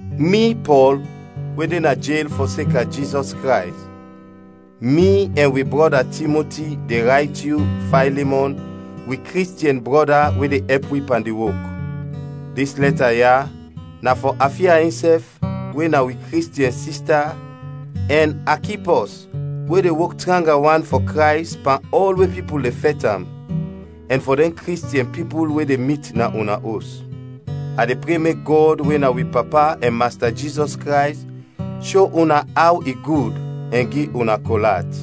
Mi, Pɔl, we de na jel fɔseka Jizɔs Krays, mi ɛn wi brɔda Timoti, de rayt yu, Faylimɔn, wi Kristiɛn brɔda we de ɛp wi pan di wok. Dis lɛta ya na fɔ Afia insɛf we na wi Kristiɛn sista, ɛn Akipɔs we de wok tranga wan fɔ Krays pan ɔl we pipul de fɛt am, ɛn fɔ dɛn Kristiɛn pipul we de mit na una os. A de pre mek Gɔd we na wi Papa ɛn Masta Jizɔs Krays sho una aw i gud ɛn gi una kol at.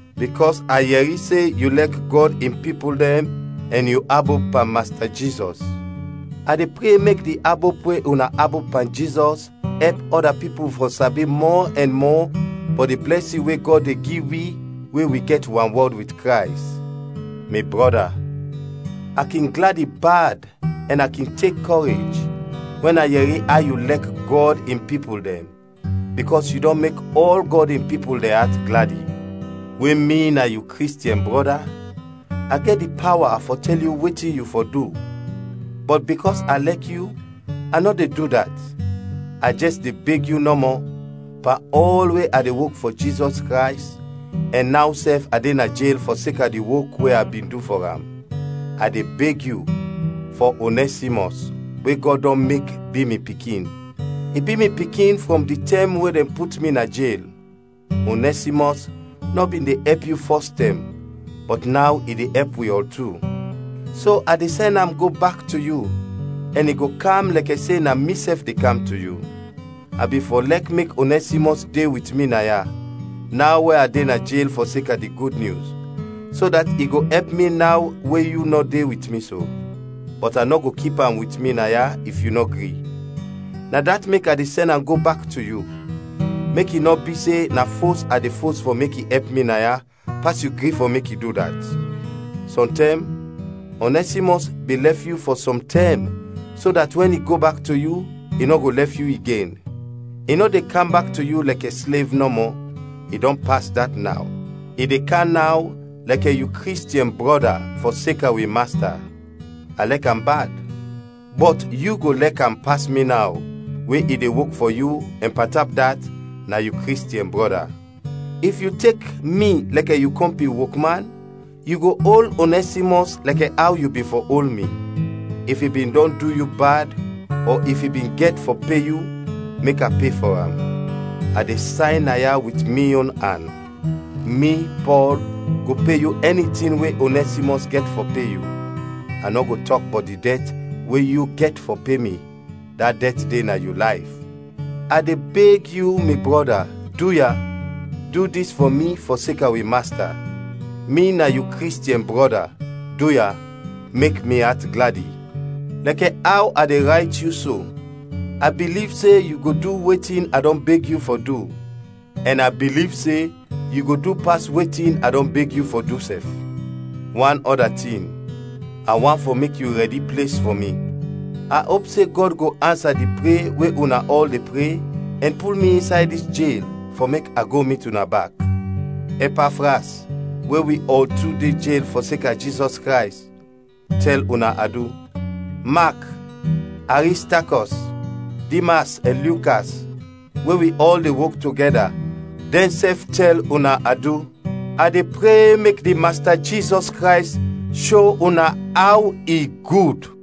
bikɔs a yɛri se yu lɛk Gɔd in pipul dɛn ɛn yu abop pan Masta Jizɔs. A de pre mek di abop we una abop pan Jizɔs ɛp ɔda pipul fɔ sabi mɔ ɛn mɔ bɔt di blɛsin we Gɔd de gi wi we wi gɛt wanwɔd wit Krays. Mi brɔda, a kin gladi bad ɛn a kin tek kɔrej wɛn a yɛri aw yu lɛk Gɔd in pipul dɛn, bikɔs yu dɔn mek ɔl Gɔd in pipul dɛn at gladi. We mi na yu Kristiɛn brɔda, a gɛt di pawa fɔ tɛl yu wetin yu fɔ du, bɔt bikɔs a lɛk yu, a nɔ de du dat, a jɛs de beg yu nɔmɔ, pan ɔl we a de wok fɔ Jizɔs Krays ɛn naw sɛf a de na jel fɔseka di wok we a bin du fɔ am. A de beg yu fɔ Onɛsimɔs we Gɔd dɔn mek bi mi pikin. I bi mi pikin frɔm di tɛm we dɛn put mi na jel. Onɛsimɔs nɔ bin de ɛp yu fɔs tɛm, bɔt naw i de ɛp wi ɔl tu. So a de sɛn am go bak to yu, ɛn i go kam lɛkɛ se na misɛf de kam to yu. A bin fɔ lɛk mek Onɛsimɔs de wit mi naya, naw we a de na jel fɔseka di Gud Nyus, so dat i kin ɛp mi naw we yu nɔ de wit mi so. Bɔt a nɔ go kip am wit mi naya if yu nɔ gri. Na dat mek a de sɛn am go bak to yu, mek i nɔ bi se na fos a de fos fɔ mek i ɛp mi naya, pas yu gri fɔ mek i du dat. Sɔntɛm Onɛsimɔs bin lɛf yu fɔ sɔm tɛm so dat wɛn i go bak to yu, i nɔ go lɛf yu igen. I nɔ de kam bak to yu lɛkɛ slev nɔmɔ, i dɔn pas dat naw. I de kam naw lɛkɛ yu Kristiɛn brɔda fɔseka wi Masta. A lɛk am bad, bɔt yu go lɛk am pas mi naw we i de wok fɔ yu ɛn pantap dat, na yu Kristiɛn brɔda. If yu tek mi lɛkɛ yu kɔmpin wokman, yu go ol Onɛsimɔs lɛkɛ aw yu bin fɔ ol mi. If i bin dɔn du yu bad ɔ if i bin gɛt fɔ pe yu, mek a pe fɔ am. A de sayn naya wit mi yon an: Mi, Pɔl, go pe yu ɛni tin we Onɛsimɔs gɛt fɔ pe yu. (A nɔ go tɔk bɔt di dɛt we yu gɛt fɔ pe mi, da dɛt de na yu layf.) A de beg yu, mi brɔda, duya, du dis fɔ mi fɔseka wi Masta. Mi na yu Kristiɛn brɔda, duya, mek mi at gladi. Lɛkɛ aw a de rayt yu so, a biliv se yu go du wetin a dɔn beg yu fɔ du, ɛn a biliv se yu go du pas wetin a dɔn beg yu fɔ du sɛf. Wan ɔda tin, a want fɔ mek yu rɛdi ples fɔ mi. A op se Gɔd go ansa di pre we una ɔl de pre ɛn pul mi insay dis jel fɔ mek a go mit una bak. Ɛpafras, we wi ɔl tu de jel fɔseka Jizɔs Krays, tɛl una adu. Mak, Aristakɔs, Dimas ɛn Lukas we wi ɔl de wok togɛda dɛnsɛf tɛl una adu. A de pre mek di Masta Jizɔs Krays sho una aw i gud.